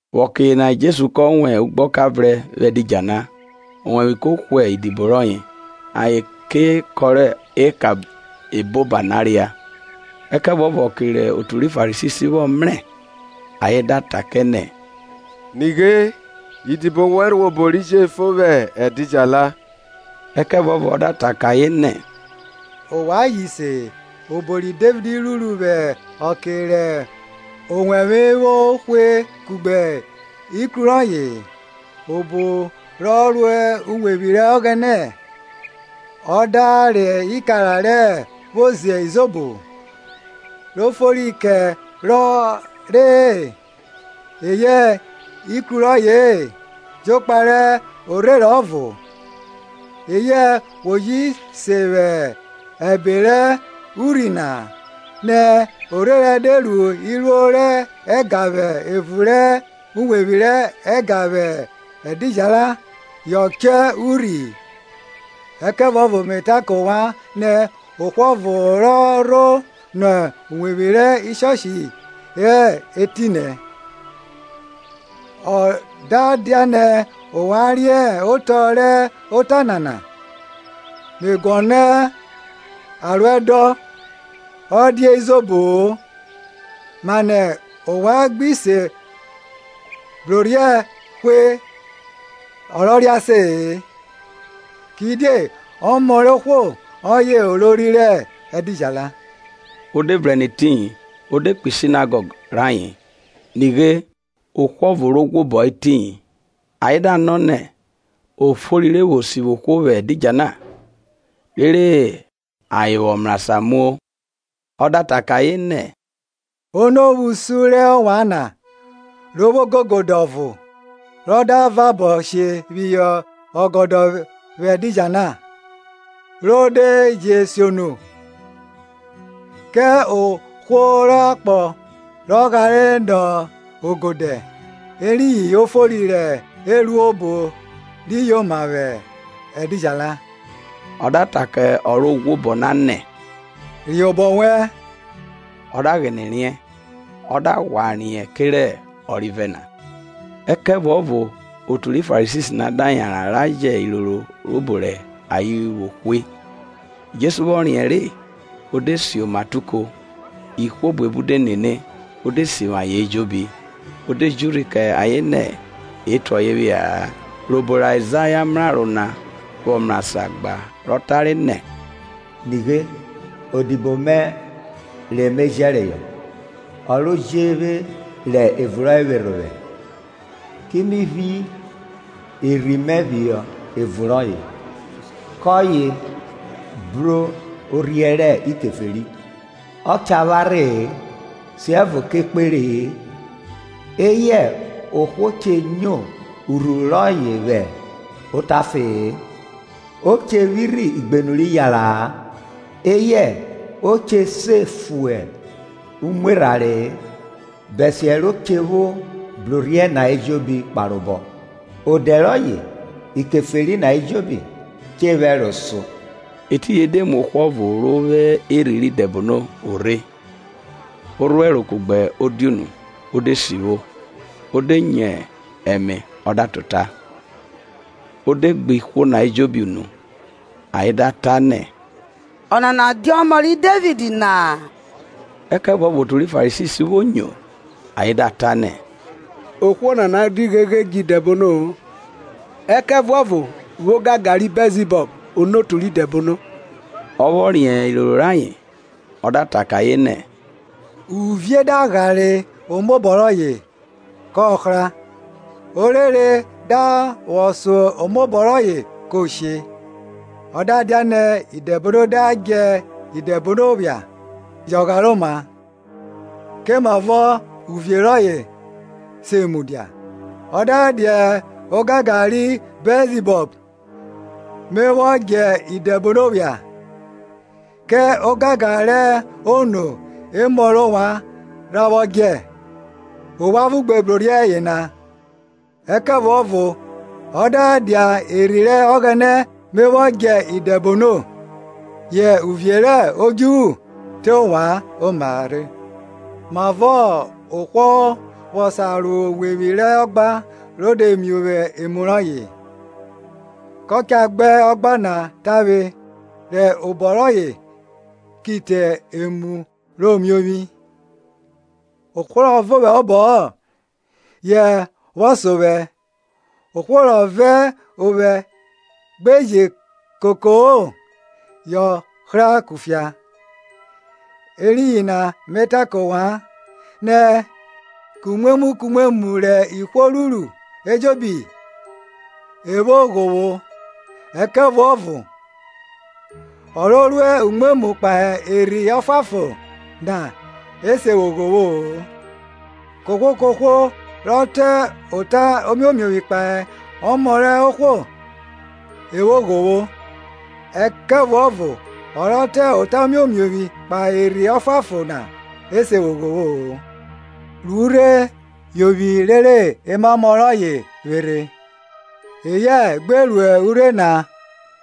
Vwẹ ọke yena Jesu kọ wan ugbeka vrẹn vwẹ edidjala; owẹvwe ko hwe idibo rọye, ayen ke kọrọ eka eboba na ria. Ẹkẹvuọvo ọke rẹ otu ri Farisi vwọ mrẹ, ayen da ta kẹ nẹ, Nighe idibo wẹn ruẹ obo ri jefo vwẹ edidjala. Ẹkẹvuọvo ọ da ta kẹ ayen nẹ, Ovwan ji se-e, obo ri Devid ruru vwẹ ọke rẹ owevwe vwo hwe kugbe ikru rọye-e; Obo rọ ro uwevwi rẹ Ọghẹnẹ, ọ da re ikara re vwo ze izobo, ro fori kẹ rọ re-e, eyẹ ikru rọye-e, jokpa rẹ orherẹn ọvo? Eyẹ we ji se vwẹ ẹbe rẹ urhi na, nẹ orherẹn de ru iruo rẹ ẹga vwẹ evun rẹ uwevwi rẹ ẹga vwẹ ẹdidjala yọ chọ urhi? Ẹkẹvuọvọ me ta kẹ ovwan nẹ, ohwo ọvo rọ rho nọ uwẹvwi rẹ ẹga na hẹ etinẹ. Ọ da dianẹ ovwan riẹ otọ rẹ ota nana, me guọnọ aruẹdọn ọ dia izobo-o, mane ovwan gbi se brorhiẹ hwe ọ rọ re ase-e. Kidie Ọmọ rẹ ohwo ọye olori rẹ ẹdidjala. O de vrẹn nẹ etiyin, o de kpo Sinagọg rẹ ayen; Nighe ohwo ọvo ro ghwobo hẹ etiyin. Ayen da nọ nẹ, ofori re vwo sivwi ohwo vwẹ edidjala? rere ayen vwọ mrasan muo. Ọ da ta kẹ ayen nẹ, Ono vwẹ usun rẹ ovwan na, ro vwo ogegede ọvo, rọ da vabo she phihọ ọgọdọ vwẹ ẹdidjala, ro de je siono? Kẹ ohwo rẹ akpọ rọ ghare nọ ogodẹ; Eriyin ofori re e ru obo ri yoma vwẹ ẹdidjala. O da ta kẹ ọ ro ghwobọ na nẹ, Riẹn obọ wẹn. Ọ da ghine riẹn, ọ da ghwa riẹn kerẹ ọrivẹ na. Ẹkẹvuọvo otu ri Farisi na da yanran ra jẹ iroro rẹ obo rẹ ayen vwo hwe. Jesu vwọ riẹn ọna re, o de si oma te uko; ihwo buebu de nene, o de sivwi ayen ejobi. O de ji urhi kẹ ayen nẹ e tue ọye phia-a. Rẹ obo rẹ Aizaya mraro na vwọ mrasan gba rọ tare nẹ, Nighe, odibo mẹ re me jẹreyọ, Ọ ro je vwe rẹ ivun rọye vwerhe ovwẹ; Ki mi phi Erhi mẹ phihọ evun roye. Kọye brorhiẹ rẹ Ikeferi. Ọ cha pharhe-e, siẹvo kẹ ekpẹre-e; Eyẹ ohwo che nyo urhuru rọye vwẹ otafe-e. O che vwirhi ugbẹn rẹ eyareya-a, Eyẹ o che se fu umwerhanre-e, Bẹsiẹ ro che vwo brorhiẹ na ejobi kparobọ. Odẹ rọye Ikeferi na ejobi cha vwẹ ẹro so. Etiyin e de mu ohwo ọvo ro vwo erhi rẹ idẹbono vwo rhe, orhuẹro kugbe odiunu, o de sivwo, o de nyo ẹme ọ da ta ota. O de gbe ihwo na ejobi unu, ayen da ta nẹ, Ọnana dia ọmọ ri Devid na? Ẹkẹvuọvo otu ri Farisi vwo nyo, ayen da ta nẹ, Ohwo nana di gheghe djẹ idẹbono-o ẹkẹvuọvo vwẹ ogangan ri Bẹlzibọl onotu rẹ idẹbono. Ọ vwọ riẹn iroro rayen, ọ da ta kẹ ayen nẹ, uvie da ghare omobọ rọye, kọ hra, orere da vwọ so omobọ rọye ko she. Ọ da dianẹ Idẹbono da djẹ Idẹbono phia, yọ ghare oma; komavọ uvie rọye se vwo mudia? Ọ da dia ogangan ri Bẹlzibọl me vwọ dje idẹbono phia, kẹ ogangan rẹ ono emọ rẹ ovwan rha vwọ djẹ? Ovwan ọvo gbe brorhiẹ yena. Ẹkẹvuọvo o da dia Erhi rẹ Ọghẹnẹ me vwọ djẹ idẹbono, yẹ uvie rẹ odjuvwu te ovwan oma re. Mavọ ohwo vwọ sa ro uwevwi rẹ ọgba ro de miovwi emu rọye? Kọ ka gba ọgba na tavwe rẹ obọ rọye ki te emu rọye miovwi. Ohwo rọ vẹ ovwẹ hẹ obọ-ọ yọ vwo so vwẹ; ohwo rọ vẹ ovwẹ gbeje koko-o yọ hra kufia. Eriyin na me ta kẹ ovwan nẹ, kumwemwu kumwemwu rẹ ihwo ruru ejobi e vwo ghovwo, ẹkẹvuọvo ọ ro ru umwemwu kpahe Erhi Ọfuanfon na e se vwo ghovwo-o. Kohwo kohwo rọ ta ota omiomiovwi kpahe ọmọ rẹ ohwo e vwo ghovwo, ẹkẹvuọvo ọ rọ ta ota omiomiovwi kpahe Erhi Ọfuanfon na e se vwo ghovwo-o. Ru urhe yovwi rere emamọ rọye vwerhe; eyẹ gbe ru urhe na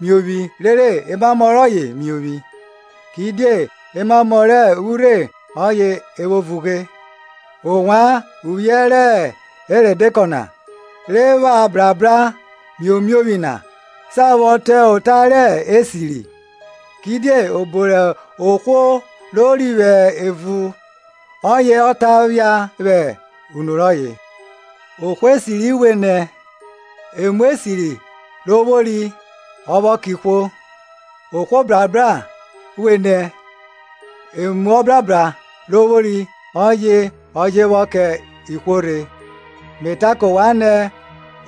miovwi rere emamọ rọye miovwi; Kidie emamọ rẹ urhe ọye e vwo vughe. Ovwan uvwiẹ rẹ erọdekọ na, re pha brabra miomiovwi na, sa vwọ ta ota rẹ esiri, kidie obo rẹ ohwo rori vwẹ evun ọye ọ ta phia vwẹ unu rọye. Ohwo esiri vwenẹ, emu esiri ro vwori ọ vwọ kẹ ihwo; ohwo ọbrabra vwenẹ, emu obrabra rọ vwori ọye ọ je vwọ kẹ Ihwo rhe. Me ta kẹ ovwan nẹ,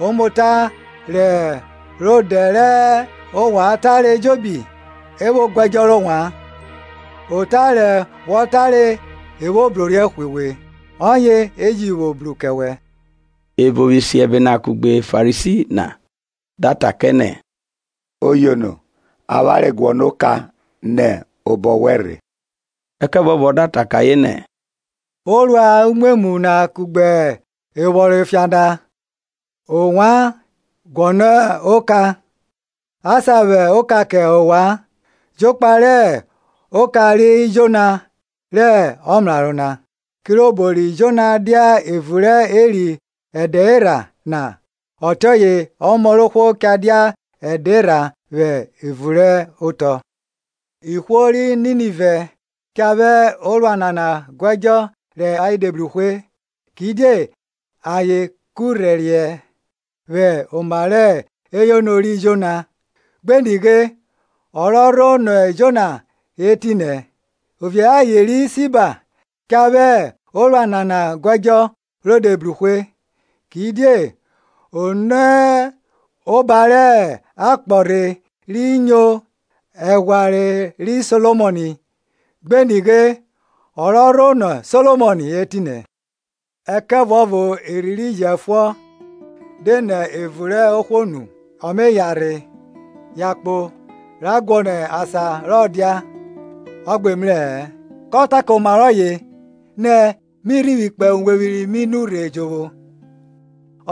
omota rẹ ọdẹ rẹ ovwan tare ejobi e vwo gu ẹdjọ rẹ ovwan. Ota re wọ tare e vwo brorhiẹ hwe we, ọye e ji vwo bru kẹ wẹ. Evo vwẹ isiẹbe na kugbe Farisi na da ta kẹ nẹ, Oyono, avwanre guọnọ oka nẹ obọ wẹn rhe. Ẹkẹvuọvo ọ da ta kẹ ayen nẹ orua umwemwu na kugbe evwọnrọn efian na, ovwan guọnọ ọka, a sa vwẹ oka kẹ ovwan, jokpa rẹ oka ri Jona rẹ ọmraro na. Kirobo ri Jona dia evun rẹ eri ẹdẹ erha na, ọtiọye Ọmọ rẹ ohwo cha dia ẹdẹ erha vwẹ evun rẹ otọ. Ihwo ri Ninive cha vwẹ orua nana guẹdjọ rẹ ayen de bru hwe. Kidie ayen kurhẹriẹ vwẹ oma rẹ eyono ri Jona; Gbe nighe, ọ rọ rho nọ Jona hẹ etinẹ. Ovie rẹ aye, Sheba cha vwẹ orua nana guẹdjọ ro de bru hwe; Kidie o nẹ oba rẹ akpọ rhe ri yono ẹghwanre ri Solomọn; gbe nighe, ọ rọ rho nọ Solomọn hẹ etinẹ. Ẹkẹvuọvo erhi ri jẹfuọn, de nẹ evun rẹ ohwo nu, ọ me yanrhẹ yankpo ra guọnọ asan rọ dia, ọ gbe mrẹ-ẹ. Kọ ta kẹ oma rọye nẹ, mi rhivwi kpo uwevwi ri mi nurhe jovwo;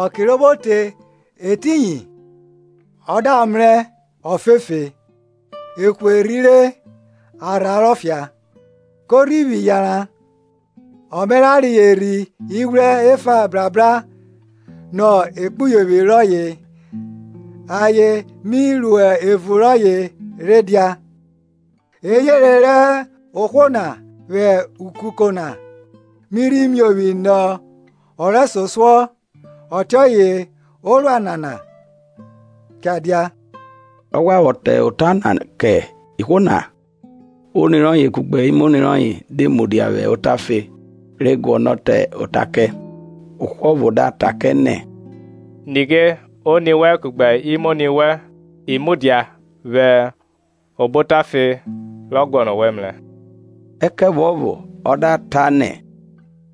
ọke ro vwo te etiyin, ọ da mrẹ ofefe e hwerhire, a rhuẹrero fia. Ko rhivwi yanran, ọ me ra reyọ erhi ighwrẹ efa re bra nọ ekpuyovwi rọye, ayen me ro evun rọye rhe dia. Eyenre rẹ ohwo na vwẹ ukuko na mi rhi miovwi nọ ọ rẹsosuọ. Ọtiọye orua nana cha dia. Rọ ghwa vwọ ta ota na kẹ ihwo na, oni rọye kugbe imoni rọye de mudia vwẹ otafe re guọnọ ta ota kẹ. Ohwo ọvo da ta kẹ nẹ, Nighe oni wẹn kugbe imoni wẹn i mudia vwẹ obo otafe re guọnọ owẹ mrẹ. Ẹkẹvuọvo ọ da ta nẹ,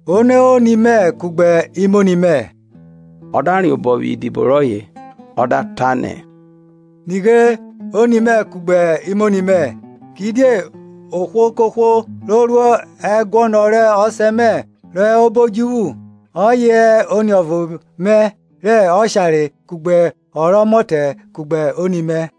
Ono hẹ oni mẹ kugbe imoni mẹ? Ọ da riẹn obọ phihọ idibo rọye, ọ da ta nẹ, Nighe oni mẹ kugbe imoni mẹ! Kidie ohwo kohwo ro ru ẹguọnọ rẹ Ọsẹ mẹ rọ hẹ obo odjuvwu, ọye hẹ oniọvo mẹ rẹ oshare kugbe ọ rọ ọmọtẹ kugbe oni mẹ.